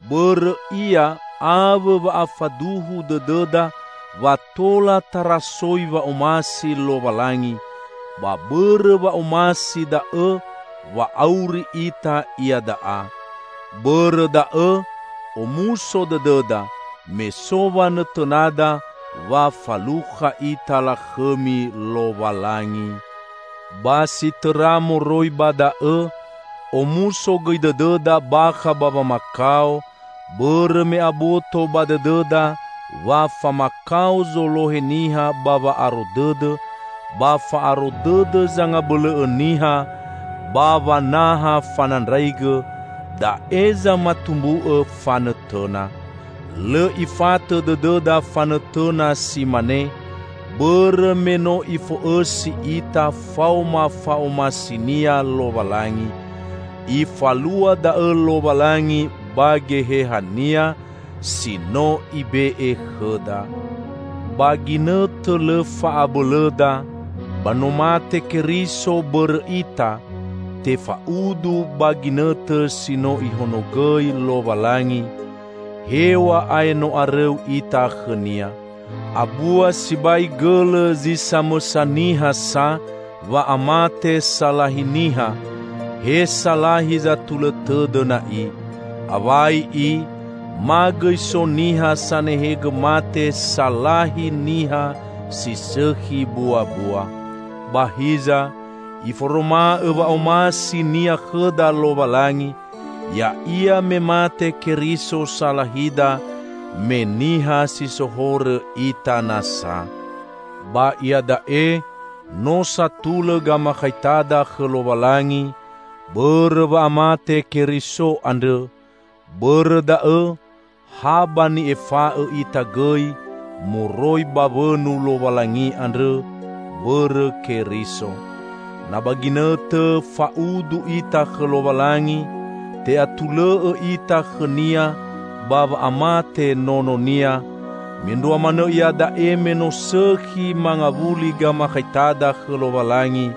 Bõrõ Ia awõ wa'afaduhu dõdõda wa tola tarasoi wa'omasi Lowalangi, ba bõrõ wa'omasi da'õ wa auri ita iada'a. Bõrõ da'õ, omuso dõdõda me so wanõtõnada wa falukha ita lakhõmi Lowalangi! Ba si tõra moroi ba da'õ, omuso gõi dõdõda bakha ba wamakao, bõrõ me aboto ba dõdõda wa famakao zolohe niha ba wa'aro dõdõ, ba fa'aro dõdõ zangabõlõ'õ niha ba wanaha fanandraigõ; da'e zamatumbu'õ fanõtõna. Lõ ifatõ dõdõda fanõtõna si mane, bõrõ me no Ifo'õsi ita faoma fa'omasi-Nia Lowalangi. Ifalua da'õ Lowalangi ba Geheha-Nia, si no Ibe'e khõda. Ba ginõtõ lõ fa'abõlõda, ba no mate Keriso bõrõ ita, tefaudu ba ginõtõ si no Ihonogõi Lowalangi; hew̃a'ae no arõu ita khõ-Nia. Abua sibai gõlõ zi samõsa niha sa wa'amate salahi niha, he salahi zatulõ tõdõ na'i. Awai i, ma gõi so niha sanehegõ mate salahi niha si sõkhi buabua. Ba hiza, Iforoma'õ wa'omasi-Nia khõda Lowalangi, ya'ia me mate Keriso salahida, me niha si so horõ ita nasa. Ba iada'e no satulõ gamakhaitada khõ Lowalangi bõrõ wa'amate Keriso andrõ; bõrõ da'õ ha ba ni'efa'õ ita gõi moroi ba wõnu Lowalangi andrõ bõrõ Keriso. Na ba ginõtõ fa'udu ita khõ Lowalangi te'atulõ'õ ita khõ-Nia ba wa'amate Nono-Nia, mendrua manõ iada'e me no sõkhi mangawuli gamakhaitada khõ Lowalangi,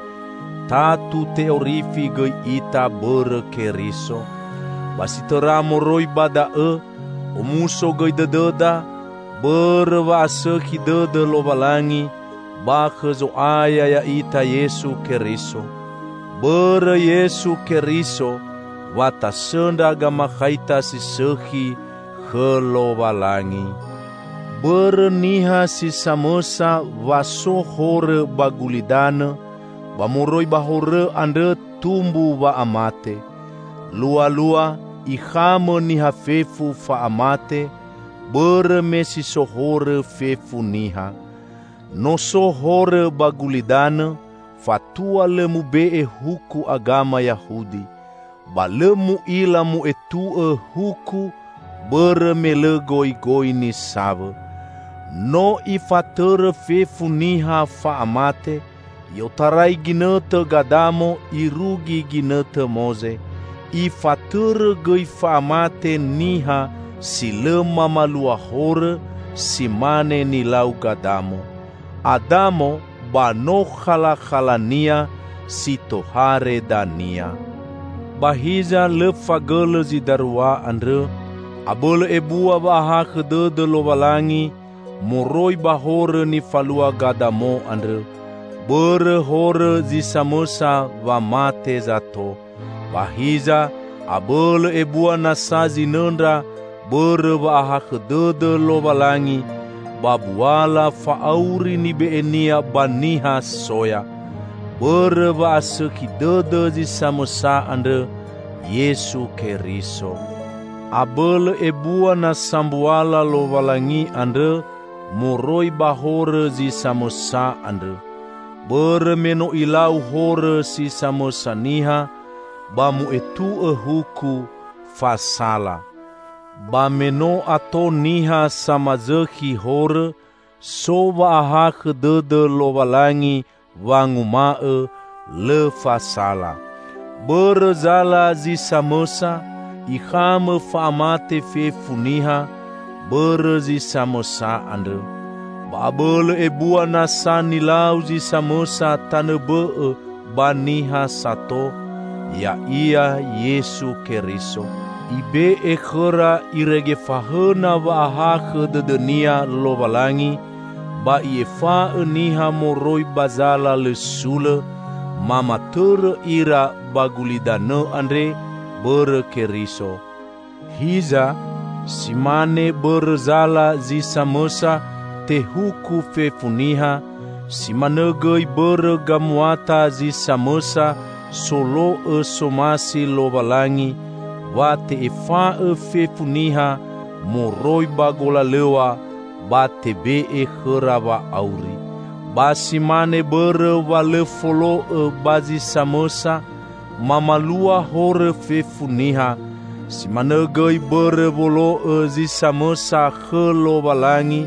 tatu te'orifi gõi ita bõrõ Keriso. Ba si tõra moroi ba da'õ, omuso gõi dõdõda bõrõ wa'asõkhi dõdõ Lowalangi ba khõ Zo'aya ya'ita Yesu Keriso. Bõrõ Yesu Keriso, wa tasõndra gamakhaita si sõkhi khõ Lowalangi. Bõrõ niha si samõsa wa so horõ ba gulidanõ, ba moroi ba horõ andrõ tumbu wa'amate. Lualua, ikhamõ niha fefu fa'amate, bõrõ me si so horõ fefu niha. No so horõ ba gulidanõ, fatua lõ mube'e huku agama Yahudi. Ba lõ mu'ila mu'etu'õ huku bõrõ me lõ goigoi nisawõ. No ifatõrõ fefu niha fa'amate i'otarai ginõtõ Gadamo irugi ginõtõ Moze. Ifatõrõ gõi fa'amate niha si lõ mamalua horõ si mane nilau Gadamo. Adamo ba no khalakhala-Nia, si tohare dania. Ba hiza, lõ fagõlõ zi darua andrõ; abõlõ ebua wa'ahakhõ dõdõ Lowalangi moroi ba horõ nifalua Gadamo andrõ. Bõrõ horõ zi samõsa wa mate zato. Ba hiza, abõlõ ebua nasa zinõndra bõrõ wa'ahakhõ dõdõ Lowalangi ba buala fa'auri nibe'e-Nia ba niha soya, bõrõ wa'asõkhi dõdõ zi samõsa andrõ, Yesu Keriso. Abõlõ ebua nasa mbuala Lowalangi andrõ moroi ba horõ zi samõsa andrõ. Bõrõ me no ilau horõ si samõsa niha, ba mu'etu'õ huku, "Fasala". Ba me no ato niha samazõkhi horõ, so wa'ahakhõ dõdõ Lowalangi wanguma'õ, "Lõ fasala". Bõrõ zala zi samõsa, ikhamõ fa'amate fefu niha bõrõ zi samõsa andrõ. Ba abõlõ ebua nasa nilau zi samõsa tanõ bõ'õ ba niha sato, ya'ia Yesu Keriso. Ibe'e khõra irege fahõna wa'ahakhõ dõdõ-Nia Lowalangi ba I'efa'õ niha moroi ba zala lõ sulõ; mamatõrõ ira ba gulidanõ andre bõrõ Keriso. Hiza, si mane bõrõ zala zi samõsa tehuku fefu niha, si manõ gõi bõrõ gamuata zi samõsa solo'õ somasi Lowalangi wa te'efa'õ fefu niha moroi ba golalõw̃a ba tebe'e khõra wa'auri. Ba si mane bõrõ wa lõ folo'õ ba zi samõsa mamalua horõ fefu niha, si manõ gõi bõrõ wolo'õ zi samõsa khõ Lowalangi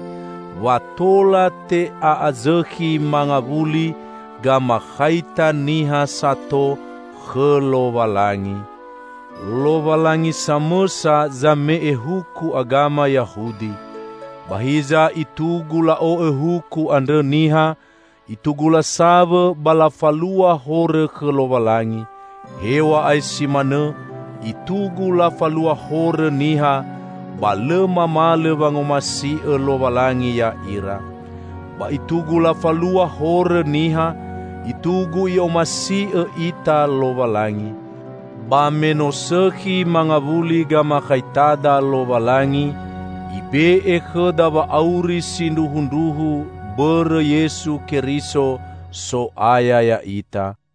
wa tola te'a'azõkhi mangawuli gamakhaita niha sato khõ Lowalangi. Lowalangi samõsa zame'e huku agama Yahudi. Ba hiza itugu la'o'õ huku andrõ niha, itugu lasawõ ba lafalua horõ khõ Lowalangi. Hew̃a'ae si manõ, itugu lafalua horõ niha, ba lõ mamalõ wangomasi'õ Lowalangi ya'ira. Ba itugu lafalua horõ niha, itugu I'omasi'õ ita Lowalangi. Ba me no sõkhi mangawuli gamakhaitada Lowalangi, Ibe'e khõda wa'auri sindruhundruhu bõrõ Yesu Keriso, So'aya ya'ita.